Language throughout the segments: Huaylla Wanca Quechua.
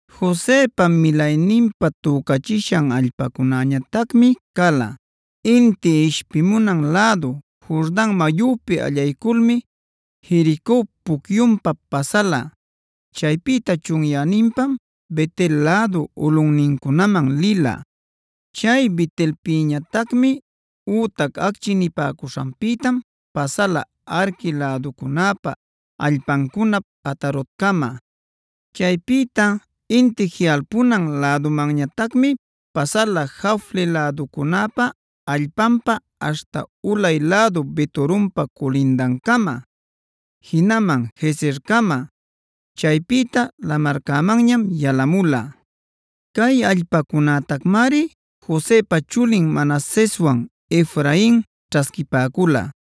Josepa milayninpa tücachishan allpacunañatacmi cala: inti ishpimunan lädu Jordan mayupi allayculmi Jerico pucyunpa pasala. Chaypïta chunyäninpam Bet-el lädu ulꞌunnincunaman lila. Chay Bet-elpïñatacmi ütac Acchi nipäcuśhanpïtam pasala Arqui läducunäpa allpancunap Atarotcama. Chaypïta inti jiꞌalpunan lädumanñatacmi pasala Jafle läducunäpa allpanpa aśhta ulay lädu Bet-horonpa culindancama, jinaman Gezercama; chaypïta lamarcämanñam yalamula. Cay allpacunactamari Josepa chulin Manaseswan Efrain ćhasquipäcula.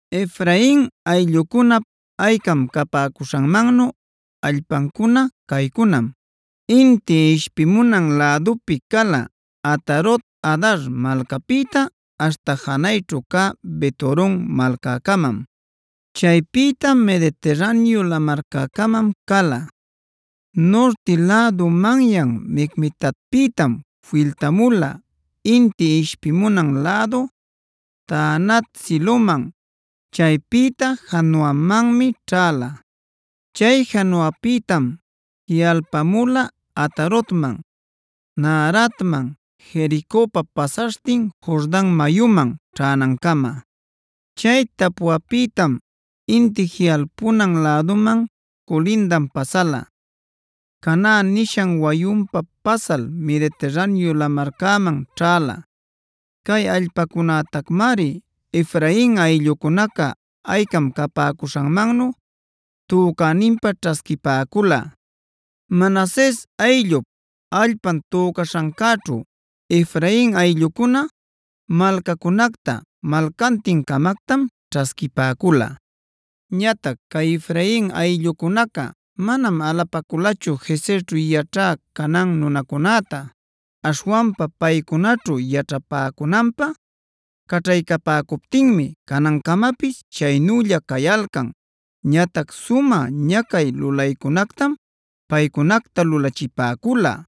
Efrain ayllucunap aycam capäcuśhanmannu allpancuna caycunam: inti ishpimunan lädupi cala Atarot-adar malcapïta aśhta janayćhu cä Bet-horon malcäcamam. Chaypïta Mediterraneo lamarcäcamam cala. Nurti lädu manyan Micmetatpïtam filtamula inti ishpimunan lädu Taanat-siloman; chaypïta Janoamanmi ćhäla. Chay Janoapïtam jiꞌalpamula Atarotman, Naaratman Jericopa pasaśhtin Jordan mayuman ćhänancama. Chay Tapuapïtam inti jiꞌalpunan läduman culindan pasala, Caná nishan wayunpa pasal Mediterraneo lamarcäman ćhäla. Cay allpacunactamari Efrain ayllucunaca aycam capäcuśhanmannu tücäninpä ćhasquipäcula. Manases ayllup allpan tücaśhancäćhu Efrain ayllucuna malcacunacta malcantin-camactam ćhasquipäcula. Ñatac cay Efrain ayllucunaca manam alapaculachu Gezerćhu yaćhä Canaan nunacunäta.a Aśhwanpa paycunaćhu yaćhapäcunanpä caćhaycapäcuptinmi canancamapis chaynülla cayalcan. Ñatac sumä ñacay lulaycunactam paycunacta lulachipäcula.